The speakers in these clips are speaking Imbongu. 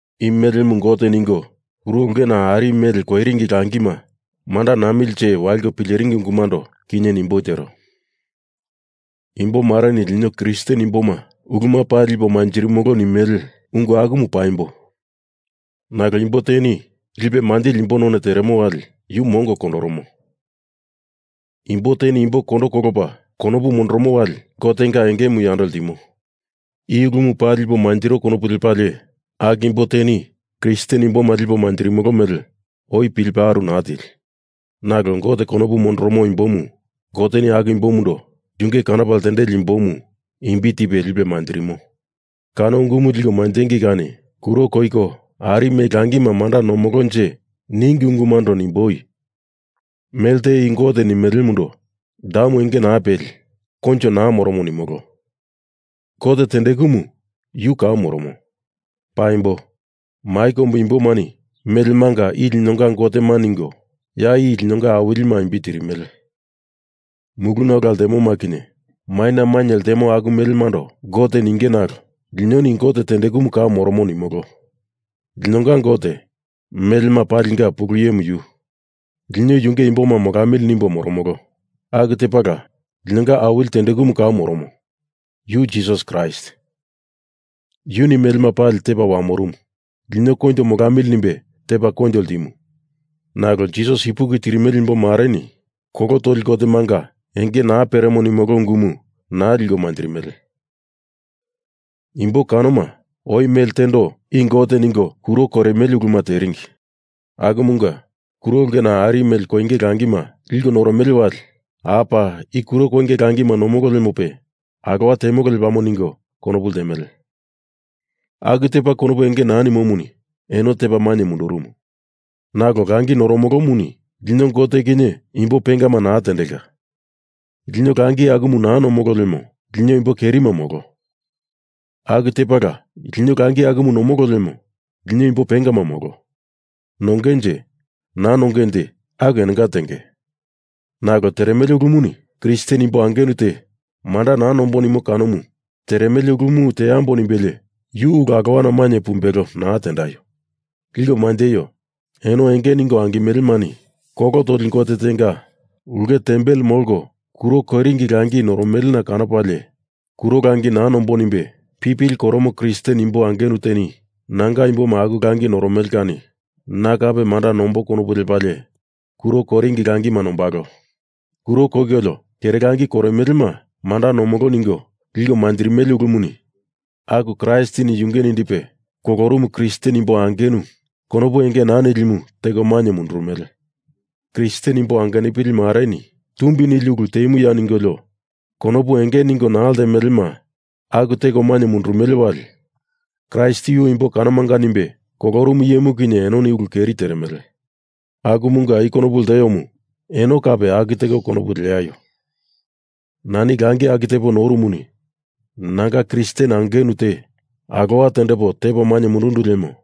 I melemu gote ningo kuro ulkena ari mele koiringi langima manda namilinje waliko pileringi ungumundo kinye nimboi tero. Imbomareni lino Kristen imboma uluma pali lipo manjirimolo nimele ungu akumu paimbo. Nalo imbo teni lipe manjili imbo none teremo wali yu mongo kondoromo. Imbo teni imboma kondo kolopa konopu mondoromo wali Gotenga engemu yando ltimo. I ulumu paa lipo manjiro konopu lepalie aku imbo teni Kristen imboma lipo manjirimolo mele oi pilipe aru naa tili. Nalo Gote konopu mondoromo imbomu Goteni aku imbomundo yunge kanopa ltendeli imbomu imbi tipe lipe manjirimo. Kano ungumu liko manjengei kani kuro koiko ari mele langima manda nomolonje ningi ungumundo nimboi. Mele te i gote nimelemundo, damu enge naa peli, koinjo naa moromo nimolo. Gote tendekumu yu kau moromo. Paimbo, mai kombu imbomani melemanga i linonga gotema ningo, ya i linonga awilima imbi tirimele. Muluna ola ltemoma kinye maina mainye ltemoma aku melemando gote ninge nalo linoni Gote tendekumu kau moromo nimolo. Linonga Gote, melema palinga pulu iyemu yu. Lino Yunge imboma molamili nimbo moromolo. Aku tepala linonga Awili tendekumu kau moromo, yu Jisas Kraist. Yuni melema pali tepa wamorumu. Lino koinjo molamili nimbe tepa koinjo ltimu. Nalo Jisas ipuki tirimele imbo mareni kolo toli gotemanga enge naa peremo nimolo ungumu naa liko manjirimele. Imbo kanoma oi mele tendo i gote ningo kuro koirimele uluma teringi. Akumunga kuro ulkena ari mele koinge langima liko noromele wali apa i kuro koinge langima nomolo lemope, alowa temolo lepamo ningo konopu ltemele. Aku tepa konopu enge naa nimomuni eno tepa mainye mundurumu. Nalo langi noromolomuni lino Gote kinye imbo pengama naa tendelka. Lino langi akumu naa nomolo lemo lino imbo kerima molo. Aku tepala lino langi akumu nomolo lemo lino imbo pengama molo. Nongenje, naa nongenje aku enonga tenge. Nalo teremele ulumuni Kristen imbo angenu te manda naa nombo nimo kanomu teremele ulu teambo nimbelie yu ulu alowana mainye pumbelo naa tendaio. Liko manjeio. Eno enge ningo angimelemani kolo toli gote tenga ulke tempel molko kuro koiringi langi noromelena kanopalie kuro langi naa nombo nimbe pipili koromo Kristen imbo angenu teni nanga imboma aku langi noromele kani na kape manda nombo konopu lepalie kuro koiringi langima nombalo. Kuro koikolio kere langi koirimelema manda nomolo ningo liko manjirimele ulumuni aku Kraistini yunge nindipe kolorumu Kristen imbo angenu konopu enge naa nilimu teko mainye mundurumele. Kristen imbo angenupili mareni tumbi nili ulu temuya ningolio konopu enge ningo naa ltemelema aku teko mainye mundurumele wali Kraist yu imbo kanomanga nimbe kolorumu iyemu kinye enoni ulu keri teremele. Akumunga i konopu lteomu eno kape aku teko konopu leaio. Nani langi aku tepo noromuni nanga Kristen angenu te alowa tendepo tepo mainye mundundu lemo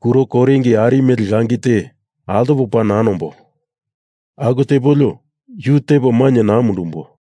kuro koiringi ari mele langi te altopo paa naa nombo. Aku tepolio, yu tepo mainye naa mundumbo.